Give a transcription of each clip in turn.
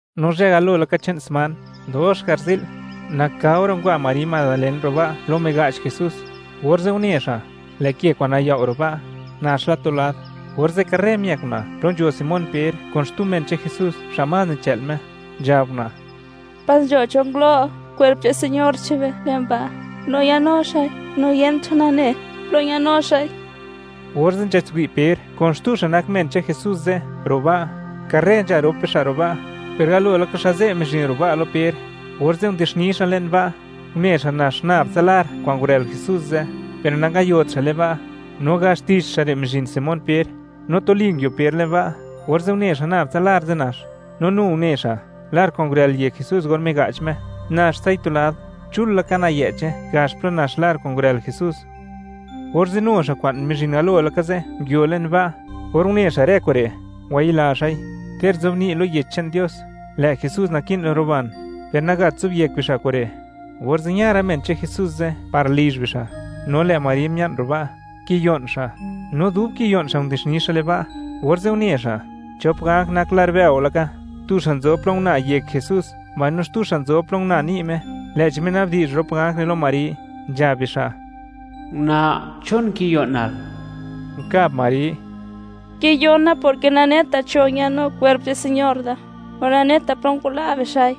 No zhë galo laka che'n sman, dox garzi'l, nakao ra' ngwa Mari Madalen ro' ba' plo miga'ch Jesús, orze' une xa', lë' ke kwa'n nayao' ro' ba', nax la tu lad. Orze' karre miëk una' plo nzho Simón Per kun xtu men che'n Jesús xa' más nichë'l Me, nzhab una': ―¡Pas nzho cho ngulo' kwerp che'n Señor che'n be le'n ba', no ñanu xa'i, mbaino yent cho nane plo ñanu xa'i! Orze' nzhatswi' Per kun xtu xa' nak men che'n Jesús ze' ro' ba'. Karre nzha rop bixa' ro' ba', per galo laka xa' ze' mizhin ro' ba' lo Per. Orze' ndixni xa' le'n ba', une xa' nax nab tsa lar kwa'n ngurël Jesús ze', per nangayot xa' le'n ba'. No gax tich xa' re' mizhin Simón Per, no tuli nguio Per le'n ba', orze' une xa' nab tsa lar ze' nax, no nu une xa', lar kwa'n ngurël yek Jesús or miga'ch Me, naxtsai tu lad, chul laka nayë'che gax plo nax lar kwa'n ngurël Jesús. Orze' nu xa' kwa'n mizhin galo laka ze' nguio le'n ba'. Or une xa' rë kure', ngwayila xa'i. Ter nzobni' lo Yech che'n Dios, lë' Jesús naki'n ruban, per nagat zobyek bixa' kure'. Orze' ña rë men che'n Me ze' par lizh bixa'. No lë' Mari mia'n ro' ba', kiyo'n xa'; no dub kiyo'n xa', ndixni xa' le'n ba', orze' une xa', chop ganj nak lar bëo laka; tu xa' nzob plo una yek Jesús, mbaino xtu xa' nzob plo una ni' Me. Lë'chi minabdi'zh rop ganj re' lo Mari, nzhab bixa': ―Una', ¿chon kiyo'nal? Unkab Mari: ―Kiyona porke naneta cho ñanu kwerp che'p Señor da, no naneta plo ngwala' bixa'i.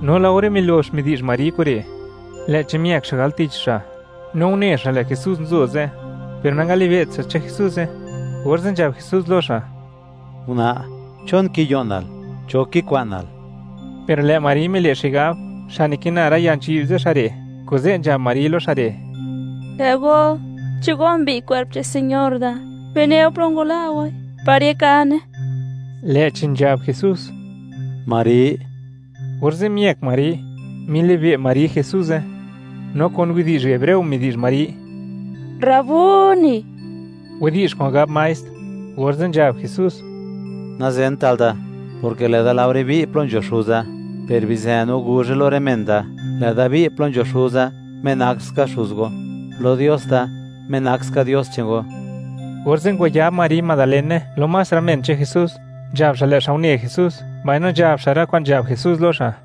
No laore milox midi'zh Mari kure', lë'chi miëk xa' al tich xa', no une xa', lë' Jesús nzo ze', per nangalibe't xa' chi Jesuze, orze' nzhab Jesús lo xa': ―Una', ¿chon kiyo'nal? ¿Cho kikwa'nal? Per lë' Mari mile' xigab, xa' nikina rë ya nzhi'b ze' xa' re', kuze' nzhab Mari lo xa' re': ―Lë' go, chi go mbi'y kwerp che'n Señor da, bineu plo ngwala' goi, par yakane. Lë'chi nzhab Jesús: ―¡Mari! Orze' miëk Mari, milibe' Mari Jesuze, no kun widi'zh hebreo midi'zh Mari: ―¡Rabuni! (widi'zh kwa'n gab Maestr). Orze' nzhab Jesús: ―Nazenta'l da, porke lë'da laore bi' plo nzho Xuza, per bizë no guzhe lo rë men da, lë'da bi' plo nzho Xuza, Me nak ska Xuz go; lo Dios da, Me nak ska Dios che'n go. Orze' ngwayab Mari Madalene lo más rë men che'n Jesús, nzhab xa', lë' xa' une Jesús, mbaino nzhab xa' rë kwa'n nzhab Jesús lo xa'.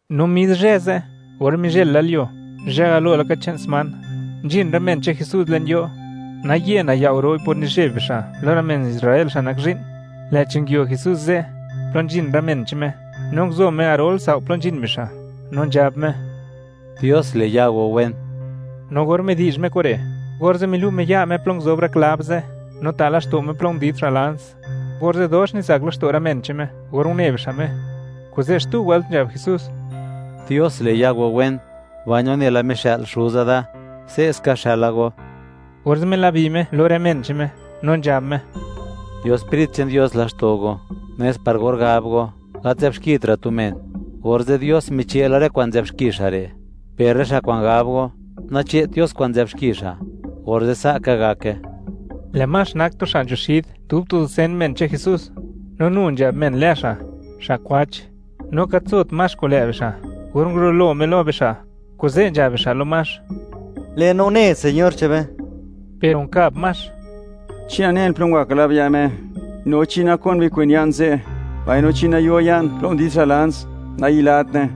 No mis zhë ze', or mizhël la lyuo, zhë galo laka che'n sman, nzhin rë men che'n Jesús le'n yo', naye nayao' ro'i por nizheb bixa' lo rë men Israel, xa' nak zhi'n. Lë'chi nguio Jesús ze' plo nzhin rë men che'n Me, no nguzo Me garol sao' plo nzhin bixa', no nzhab Me: ―¡Dios le' ya go wen! No or midi'zh Me kure', orze' milu' Me ya' Me plo nguzob rë klab ze', no ta' laxto' Me plo ndid xa' lans, orze' dox nizak laxto' rë men che'n Me or une bixa' Me. Kuze' xtu wëlt nzhab Jesús: ―¡Dios le' ya go wen! Mbaino nela mixë'l Xuza da, se'ska xëla go. Orze' milabi Me lo rë men che'n Me, no nzhab Me: ―Yo Sprit che'n Dios laxto' go, nes par or gab go, gat nzë'bxkitra' tu men, orze' Dios miche' la rë kwa'n nzë'b xki xa' re'; per rë xa' kwa'n gab go, nache't Dios kwa'n nzë'b xki xa', orze' sa' ka gake. Lë' Max nak tu xa' nzho xid dub tu dusen men che'n Jesús, no nu nzhab men lë xa': “Xa' kwach”, no gat nzot Max kun lë' bixa' or ngurulo Me lo bixa', kuze' nzhab bixa' lo Max: ―Lë'no une Señor che'n be. Per unkab Max: ―Chi nanen plo ngwa klab ya' Me, no chi nakon bikwen ya'n ze', mbaino chi nayo ya'n plo ndid xa' lans, nayilatne.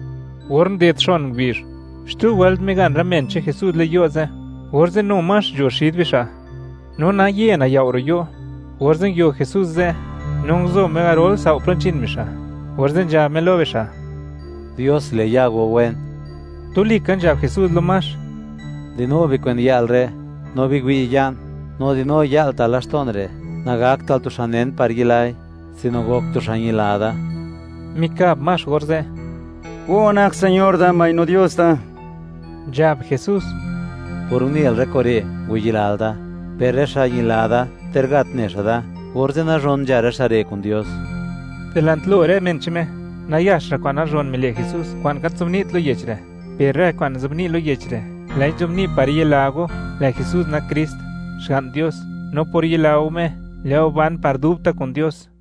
Or nded xon ngubizh, xtu wëlt migan rë men che'n Jesús le'n yo' ze', orze' nu Max nzho xid bixa', no naye nayao' ro' yo', orze' nguio Jesús ze', no nguzo Me garol sao' plo nzhin bixa', orze' nzhab Me lo bixa': ―¡Dios le' ya go wen! Tuli ka nzhab Jesús lo Max: ―Di'nu bikwen ya'l re', no biwi' ya'n; no di'nu ya'l ta' laxto'n re'. Nagaktra'l tu xa' nen par yilai, sino gok tu xa' ñila da. Mikab Max orze': ―¡Go nak Señor da, mbaino Dios da! Nzhab Jesús: ―Por unel rë kure', ngwayilal da. Per rë xa' ñila da ter gat ne xa' da, orze' nazhon nzha rë xa' re' kun Dios. Dilant lo rë men che'n Me, nayax ra' kwa'n nazhon mile' Jesús kwa'n gat zobni't lo yech re', per rë kwa'n nzobni' lo yech re', lë'i nzobni' par yila go, lë' Jesús nak Krist, Xga'n Dios; no por yila go Me, lë' go ban par dubta' kun Dios.